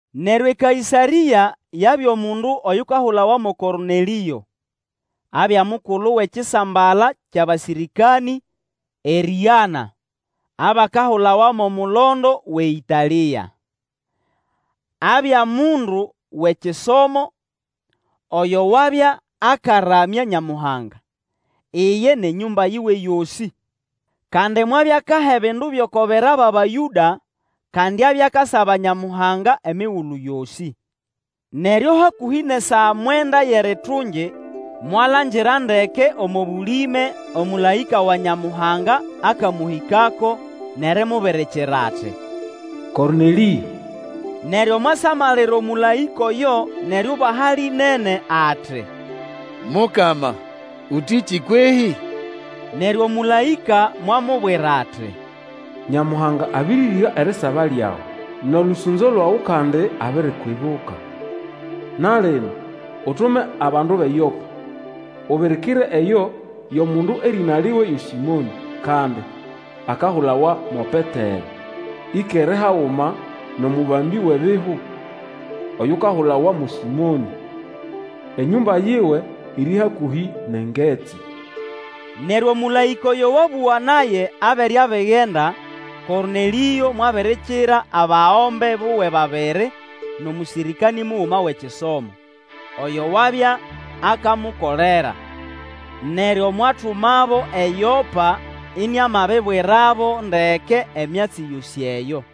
Neryo Ekaĩsarĩa yabya omundu oyukahulawa mo Kornelĩo. Abya mukulu wʼekisambala kyʼabasĩrĩkanĩ erĩgana, abakahulawa mo mulondo wʼeĩtalĩa. Abya mundu wʼeKisomo, oyo wabya akaramya Nyamuhanga, iye nʼenyũmba yiwe yosĩ. Kandi mwabya akaha ebindu byʼoko bera bʼAbayũda, kandi abya akasaba Nyamuhanga emigulu yosĩ. Neryo hakũhĩ nʼesaa mwenda yʼeritungi, mwalangira ndeke omo bũlĩme omũlaĩka wa Nyamuhanga akamũhĩkako, nʼerimubirikira ati, Kornelĩo! Neryo mwasamalira omũlaĩka oyo nʼeriubaha lĩnene, ati, Mukama, ũtĩkĩ kwehĩ? Neryo omũlaĩka mwamubwira ati, Nyamuhanga abĩrĩrĩga erisaba lyawe, nʼolũsũnzo lwawe, kandi abirikwibuka. Na lino Utume abandu bʼeYopa, ubirikire eyo yʼomundu erĩna liwe yo Sĩmonĩ, kandi akahulawa mo Petero. Ĩkere haguma nʼomũbambĩ wiebihu, oyukahulawa mo Sĩmonĩ. Enyũmba yiwe iri hakũhĩ nʼengetsi. Neryo omũlaĩka oyo wabũga naye abere abigenda, Kornelĩo mwabirikira abagombe buwe babiri nʼomũsĩrĩkanĩ muguma wʼekisomo, oyo wabya akamukolera. Neryo mwatumabo eYopa iniamabibwirabo ndeke emyatsi yosĩ eyo.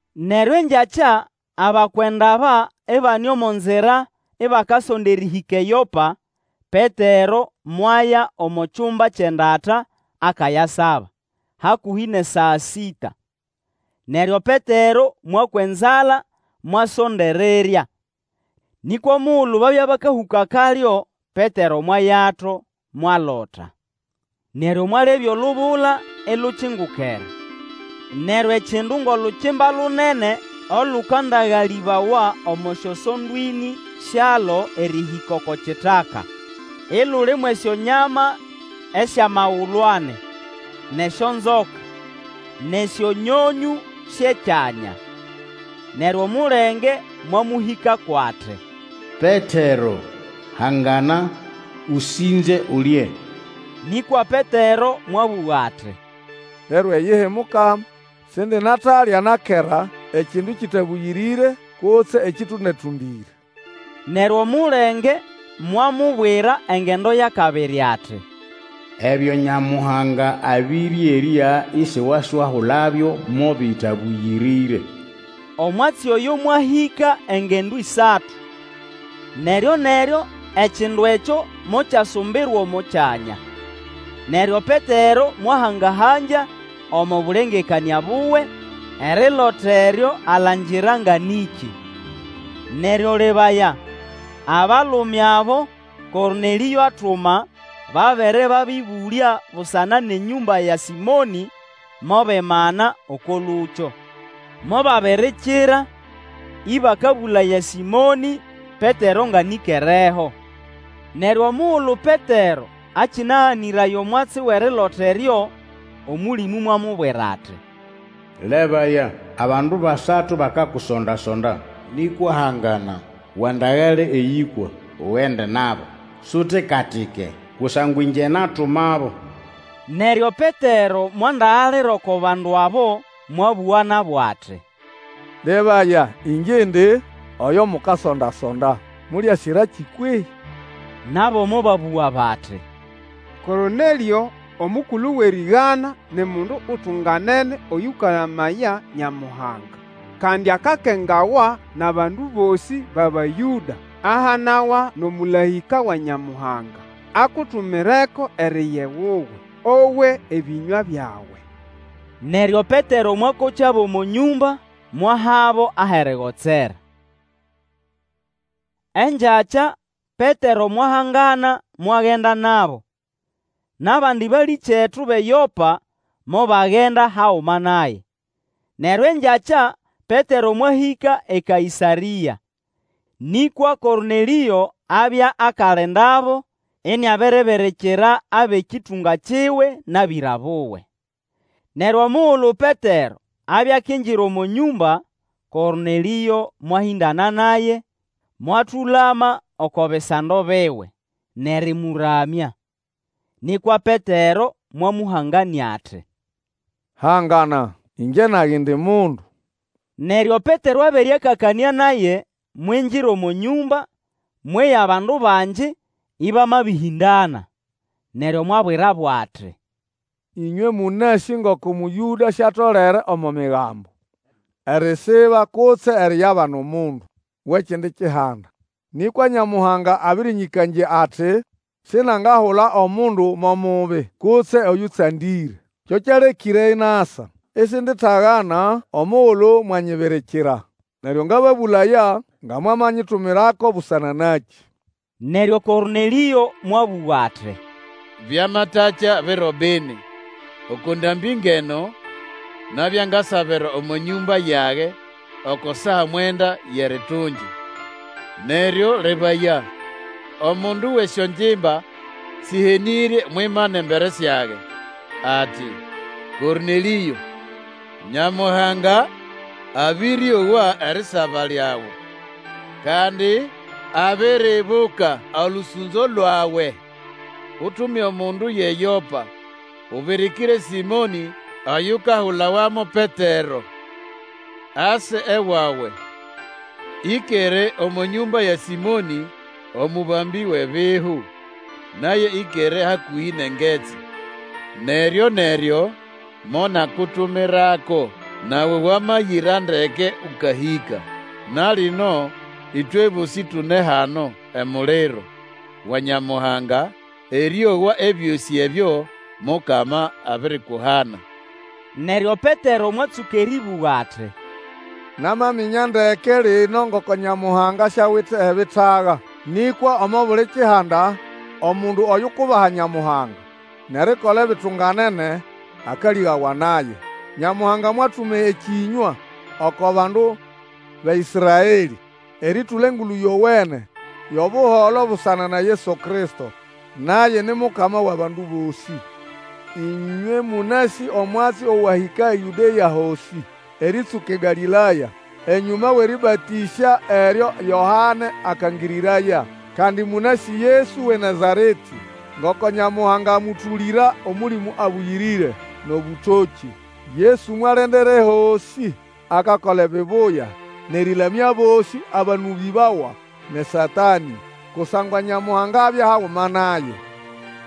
Neryo engyakya abakwenda aba ibane omo nzira ibakasonda erĩhĩka eYopa, Petero mwaya omo kyumba kyʼendata akayasaba, hakũhĩ nʼesaa sĩta. Neryo Petero mwakwa enzala mwasonda erirya. Nĩkwa omugulu babya bakahũka kalyo, Petero mwayato, mwalota. Neryo mwalebya olubula ilukingukere, neryo ekindu ngʼolukimba lunene olũkandagalĩbawa omo syosondo ĩnĩ syalo erĩhĩka oko kitaka. Ituli mwʼesyonyama esyʼamagulu ani, nʼesyonzoka, nʼesyonyonyũ syʼekyanya. Neryo omulenge mwamũhĩkako ati, Petero, hangana, ũsĩnze, ulye. Nĩkwa Petero mwabũga ati, Lero iyihi, Mukama! Sindinatalya na kera ekindu kĩtabũyĩrĩre kutse ekĩtũnda-tũndĩre. Neryo omulenge mwamubwira engendo yʼakabiri ati, Ebyo Nyamuhanga abĩrĩerya, isiwaswahulabyo mo bĩtabũyĩrĩre. Omwatsi oyo mwahĩka engendo ĩsatu; neryo-neryo ekindu ekyo mokyasumbirwa omo kyanya. Neryo Petero mwahanga-hangya omo bũlengekanĩa buwe erilota eryo alangira nga nĩkĩ. Neryo, lebaya, abalume abo Kornelĩo atuma, babere babĩbũlya busana nʼenyũmba ya Sĩmonĩ, mobimana oko lũkyo. Mobabirikira Ĩbakabũlaya Sĩmonĩ Petero ngʼanĩkereho. Neryo omugulu Petero akĩnaganĩraya omwatsi wʼerilota eryo, Omũlĩmũ mwamubwira ati. Lebaya! abandu basatu bakakusonda-sonda. Nĩkwa hangana, Wandagale eyĩkwa, ugende nabo; sutika-tike, kusangwa ĩngye natumabo. Neryo Petero mwandagalira oko bandu abo, mwabũga nabo ati, Lebaya, ĩngye indi oyo mukasonda-sonda. Mũlĩasirakĩ kwehĩ? Nabo mobabũga bati, Kornelĩo, omukulu wʼerĩgana, ni mundu utunganene oyũkaramaya Nyamuhanga, kandi akakengawa nʼabandu bosĩ bʼAbayũda. Ahanawa nʼomũlaĩka wa Nyamuhanga akutumireko eriya ewuwe, owe ebĩnywa byawe. Neryo Petero mwakokyabo omo nyũmba mwahabo ahʼerigotsera. Engyakya Petero mwahangana mwagenda nabo, nʼabandi balĩkyetu bʼeYopa mobagenda haguma naye. Neryo engyakya Petero mwahĩka eKaĩsarĩa. Nĩkwa Kornelĩo abya akalindabo, iniabiribirikira abʼekĩtũnga kiwe nʼabĩra buwe. Neryo omugulu Petero abya akingira omo nyũmba, Kornelĩo mwahĩndana naye, mwatũlama oko bisando biwe, nʼerĩmũramya. Nĩkwa Petero mwamũhanganĩa ati, Hangana, ĩngye nage indi mundu. Neryo Petero abere akakanĩa naye, mwingira omo nyũmba, mweya bandu bangi ĩbamabĩhĩndana. Neryo mwabwirabo ati, Ĩnywe mũnasĩ ngoko Mũyũda siatolere omo Migambo erisiba kutse eriyabana omundu wʼekindi kihanda. Nĩkwa Nyamuhanga abĩrĩnyĩkangya ati sinangahula omundu mo mubi kutse oyũtsandĩre. Kyo kyalekĩre masa, isinditagana omugulu mwanyibirikira. Neryo ngababũlaya nga mwamanyitumirako busana nakĩ? Neryo Kornelĩo mwabũga ati, Byamatakya biro bini, oko ndambĩ ngʼeno, nabya ngasabira omo nyũmba yage oko saa mwenda yʼeritungi, Neryo lebaya, omundu wʼesyongimba sĩhenĩrye mwimana embere syage, ati, Kornelĩo! Nyamuhanga abĩrĩowa erisaba lyawe, kandi abiryibuka olũsũnzo lwawe. Utume omundu yʼeYopa, ubirikire Sĩmonĩ oyukahulawa mo Petero, ase ewawe, Ĩkere omo nyũmba ya Sĩmonĩ omũbambĩ wʼebihu, naye ĩkere hakũhĩ nʼengetsi. Neryo-neryo monakutumirako, nawe wamayira ndeke ũkahĩka. Na lino ĩtwe bosĩ tune hano emuliro wa Nyamuhanga erĩowa ebyosĩ ebyo Mukama abirikuhana. Neryo Petero mwatsũka erĩbũga ati, Namaminya ndeke lino ngoko Nyamuhanga siawite ebitaga. Nĩkwa omo buli kihanda omundu oyukubaha Nyamuhanga, nʼerikola ebitunganene akalĩgawa naye. Nyamuhanga mwatuma ekĩnywa oko bandu ba Ĩsraelĩ, erĩtũla Engulu Yowene yʼobuholo busana na Yesu Kristo, naye ni Mukama wʼabandu bosĩ. Ĩnywe mũnasĩ omwatsi owahĩka eYũdea hosĩ, erĩtsũka eGalĩlaya, enyũma wʼerĩbatĩsya eryo Yoane akangĩrĩraya. Kandi mũnasĩ Yesu wʼeNazaretĩ, ngoko Nyamuhanga amũtũlĩra Omũlĩmũ Abũyĩrĩre nʼobũtokĩ. Yesu mwalendera ehosĩ akakola ebibuya, nʼerĩlamya abosĩ abanũbĩbawa nʼeSatanĩ, kusangwa Nyamuhanga abya haguma naye.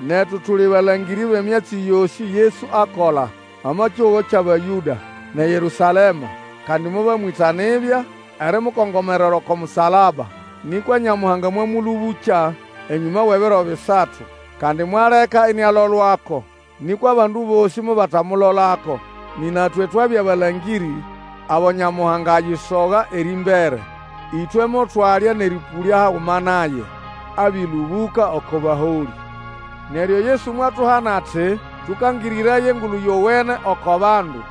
Netu tuli balangĩrĩ bʼemyatsi yosĩ Yesu akola omo kihugo kyʼAbayũda nʼeYerũsalema. Kandi mobamwĩta nibya erimukongomerera oko musalaba. Nĩkwa Nyamuhanga mwamũlũbũkya enyũma wʼebiro bisatu, kandi mwaleka inialolwako. Nĩkwa abandu bosĩ mobatamulolako, nĩna twe twabya balangĩrĩ abo Nyamuhanga ayisoga erĩmbere, Ĩtwe motwalya nʼerĩpũlya haguma naye abĩlũbũka oko baholĩ. Neryo Yesu mwatuhana ati tũkangĩrĩraye Engulu Yowene oko bandu,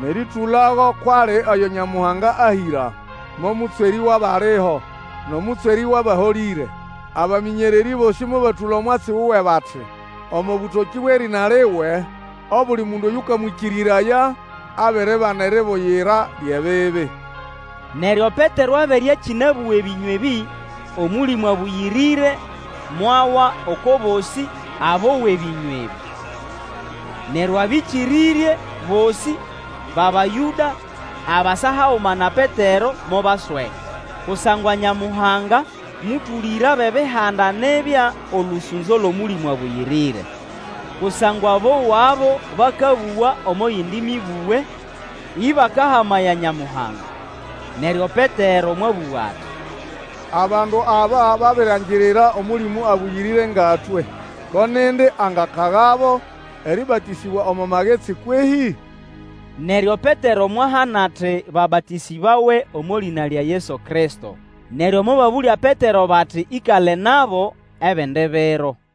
nʼerĩtũlago kwʼali Oyo Nyamuhanga ahĩra mo Mũtswerĩ wʼabaliho, nʼomũtswerĩ wʼabaholĩre. Abamĩnyererĩ bosĩ mobatũla omwatsi wuwe bati, Omo bũtokĩ bwʼerĩna liwe obuli mundu oyũkamwĩkĩrĩraya abiribana eribuyira lyʼebibi. Neryo Petero abere akĩnabũga ebĩnywa ebĩ, Omũlĩmũ Abũyĩrĩre mwawa oko bosĩ abowa ebĩnywa ebĩ. Neryo abikĩrĩrye bosĩ bʼAbayũda abasa haguma na Petero mobasweka, kusangwa Nyamuhanga mũtũlĩra abʼEbihanda nibya olũsũnzo lwʼOmũlĩmũ Abũyĩrĩre. Kusangwa bowabo bakabũga omo yindi mĩbũge, ĩbakahamaya Nyamuhanga. Neryo Petero mwabũga ati, Abandu aba babiriangirira Omũlĩmũ Abũyĩrĩre nga twe, Ko nindi angakagabo erĩbatĩsĩbwa omo magetsi kwehĩ? Neryo Petero mwahana ati babatĩsĩbawe omo lĩna lya Yesu Kristo. Neryo mobabũlya Petero bati ĩkale nabo ebindi biro.